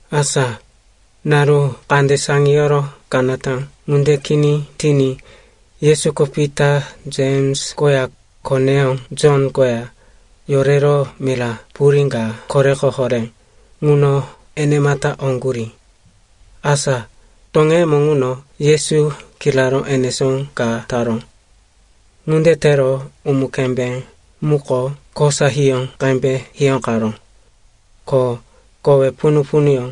Asa naru kande saŋiyoro kanata ŋunde kini tiní Yesuko Pita, Jems koya koneyó Jon koya yorero mira purí ka koreko horé ŋuno enemata oŋgurí. Asa toŋeyemo ŋuno Yesu kiraró enesó ka taró. Ŋunde tero umu-kembé muko kosa hiyó qembe hiyóqaró. Ko kowe punu-punuyó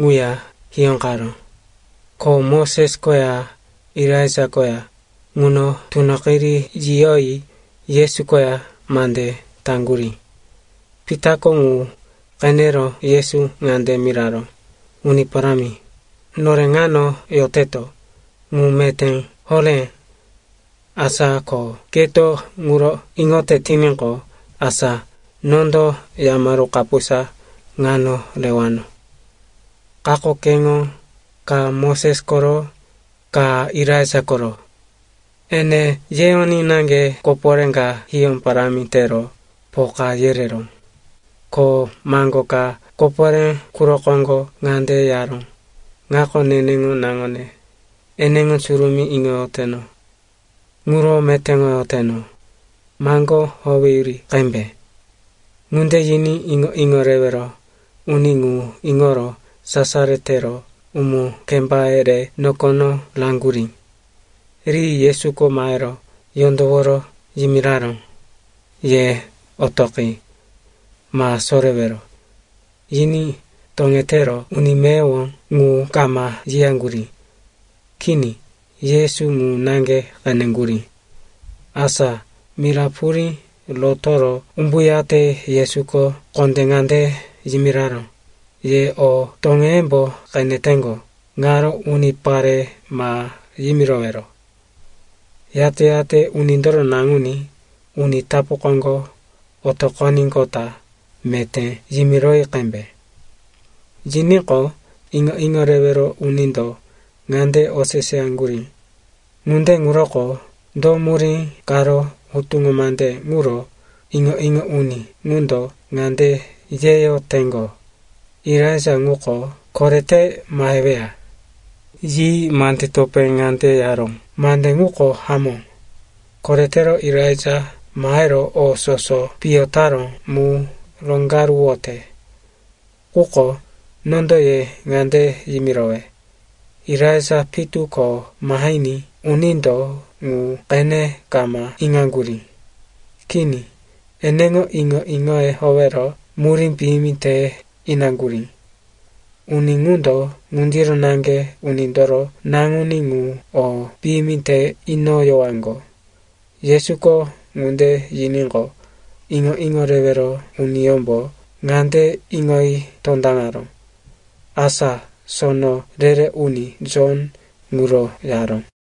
ŋuya hiyóqaró. Ko Moses koya Elaija koya ŋuno tunoqiri yiyoyi Yesu koya mande taŋgurí. Pitako ŋu qenero Yesu ŋande miraró, “Uni Parámi, nore ŋano yoteto, ŋu meté horé. Asa ko keto ŋuro iŋote tiníqo, asa nondo yamaru kapusa ŋano rewano. Kako keŋo, ka Moses koro, ka Elaija koro.” Ene yeyoní naŋge koporé ka hiyó parámi tero poka yereró. Ko maŋgo ka koporé quro koŋgo ŋande yaró, “Ŋako neneŋo naŋone, eneŋo surumí iŋoyoteno. Ŋuro metéŋoyoteno. Maŋgó howeyuri qembe.” Ŋunde yiní iŋo-iŋo rewero uni ŋu iŋoro sasaro tero umu-kembaye re nokono raŋgurí. Ri Yesuko mahero yondoworo yimiraró, “Ye otoqi. Ma sorewero.” Yiní toŋetero uni meyowo ŋu kama yiyaŋgurí. Kini, Yesu ŋu naŋge qeneŋgurí. Asa mira purí rotoro umbuyate Yesuko kondé ŋande yimiraró, “Ye o toŋeyembo qeneteŋgo ŋaro unipare ma yimirowero. Yate-yate Unindoro Naŋuní uni tapu koŋgo otoqoníqota meté yimiroyi qembe.” Yiníqo, iŋo-iŋo rewero unindo ŋande oseseyaŋgurí, “Ŋunde ŋuroko do murí karo hutuŋo mande ŋuro iŋo-iŋo uni ŋundo ŋande yeyoteŋgo, Elaija ŋuko korete maheweya?” Yi mande topé ŋande yaró, “Mande ŋuko hamó. Koretero Elaija mahero o soso piyo taró mu roŋgaruwote. Quko nondo ye ŋande yimirowe, Elaija pitu ko mahiní unindo ŋu qene kama iŋaŋgurí. Kini. Eneŋo iŋo-iŋoye howero murí piyimi te inaŋgurí. Uni ŋundo ŋundiro naŋge Unindoro Naŋuní ŋu o piyimi te inoyowaŋgo.” Yesuko ŋunde yiníqo, iŋo-iŋo rewero uniyómbo ŋande iŋoyi tondaŋaró, asa sono re-re uni, Jon, ŋuro yaró.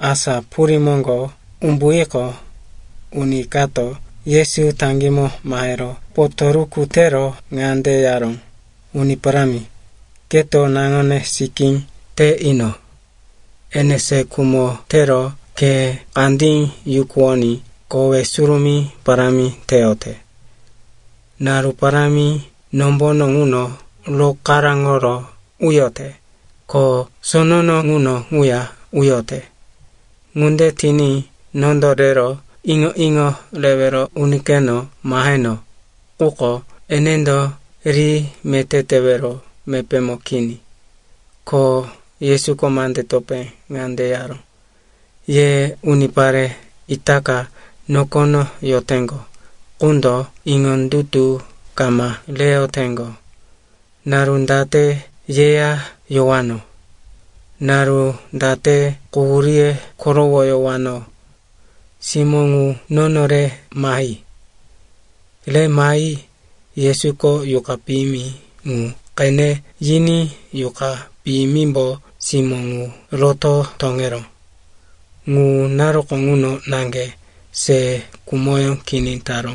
Asa purí moŋgo umbuyiqo, uni kato Yesu taŋgímo mahero potoruku tero ŋande yaró, “Uni Parámi, keto naŋone sikí te ino. Ene se khumo tero khe kandí yukuwoní kowe surumí parámi teyote. Naru parámi nombono ŋuno rokaráŋo uyote, ko sonono ŋuno ŋuya uyote. Ŋunde tiní nondo rero iŋo-iŋo rewero unikeno maheno, quko enendo ri meté tewero mepémo kini.” Ko Yesuko mande topé ŋande yaró, “Ye unipare itaka nokono yoteŋgo qundo iŋondutu kama reyoteŋgo! Naru date yeya yowano? Naru date quhuríye korowoyowano? Simó ŋu nono re mahi.” Re mahi Yesuko yuqa piyimi ŋu qene yiní yuqa piyimimbo simó ŋu roto toŋeró. Ŋu naruko ŋuno naŋge se khumoyó kini taró.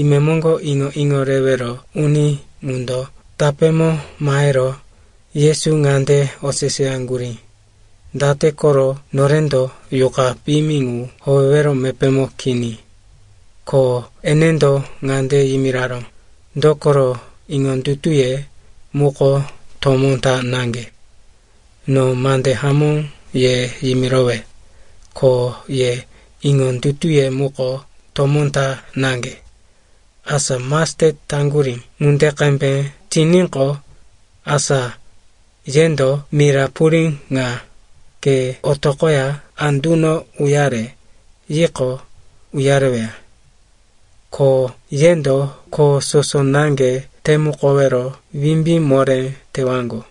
Imemoŋgo iŋo-iŋo rewero uni ŋundo tapémo mahero Yesu ŋande oseseyaŋgurí, “Date koro norendo yuqa piyimi ŋu howewero mepémo kini?” Ko enendo ŋande yimiraró, “Dokoro iŋondutuye muko tomó ta naŋge. No mande hamó ye yimirowe, ko ye iŋondutuye muko tomó ta naŋge, asa mastet taŋgurí ŋunde qembe tiníqo, asa yendo mira purí ŋa, ‘Ke otoqoya anduno uyare,’ yiqo, uyareweya. Ko yendo kho soso naŋge temukowero wimbí moré tewaŋgo.”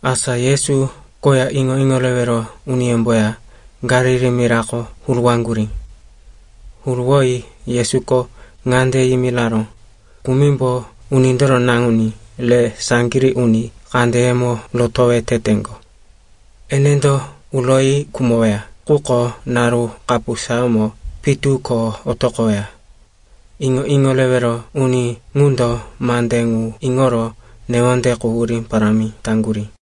Asa Yesu koya iŋo-iŋo rewero uniyómboya Galili mirako huruwaŋgurí. Huruwoyi Yesuko ŋande yimiraró, “Kumimbo Unindoro Naŋuní re saŋgirí uni kandeyemo rotowe teteŋgo. Enendo uroyi khumoweya, quko naru kapusayómo pitu ko otoqoweya.” Iŋo-iŋo rewero uni ŋundo mande ŋu iŋoro newonde quhurí parámi taŋgurí.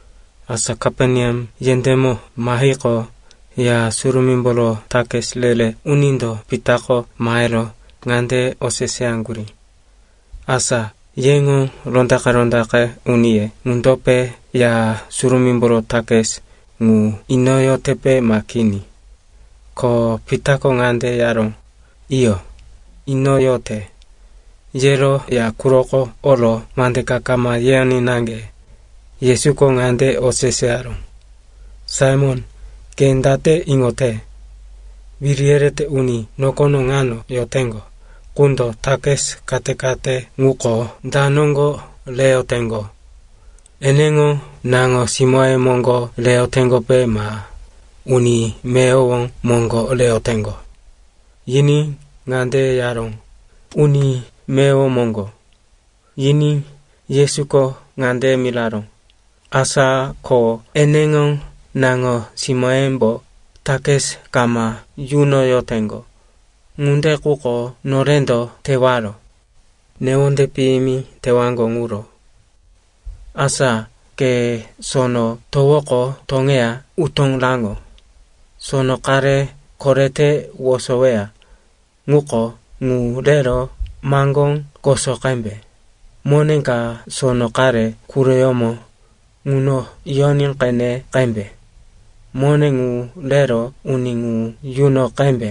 Asa Kaperneam yendémo mahiqo, Ya Surumímboro takis re-re unindo Pitako mahero ŋande oseseyaŋgurí, “Asa yeŋo rondaqe-rondaqe uniye ŋundope Ya Surumímboro takis ŋu inoyotepe ma kini?” Ko Pitako ŋande yaró, “Iyo, inoyote.” Yero ya quroko oro mande ka kama yeyoní naŋge, Yesuko ŋande oseseyaró, “Saimon, ke date iŋote? Wiri yerete uni nokono ŋano yoteŋgo qundo takis kate-kate ŋuko da noŋgo reyoteŋgo? Eneŋo naŋo-simóye moŋgo reyoteŋgope ma uni meyowo moŋgo reyoteŋgo?” Yiní ŋande yaró, “Uni meyowo moŋgo.” Yiní Yesuko ŋande miraró, “Asa ko eneŋo naŋo-simóyembo takis kama yunoyoteŋgo. Ŋunde quko norendo tewaro, newonde piyimi tewaŋgo ŋuro. Asa ke sono towoko toŋeya utó raŋo. Sono qare korete wosoweya ŋuko, ŋu rero maŋgó koso qembe, mone ka sono qare quroyómo ŋuno yoní qene qembe. Mone ŋu rero uni ŋu yuno qembe,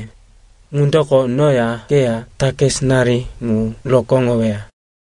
ŋundoko noya keya takisinari ŋu rokóŋoweya.”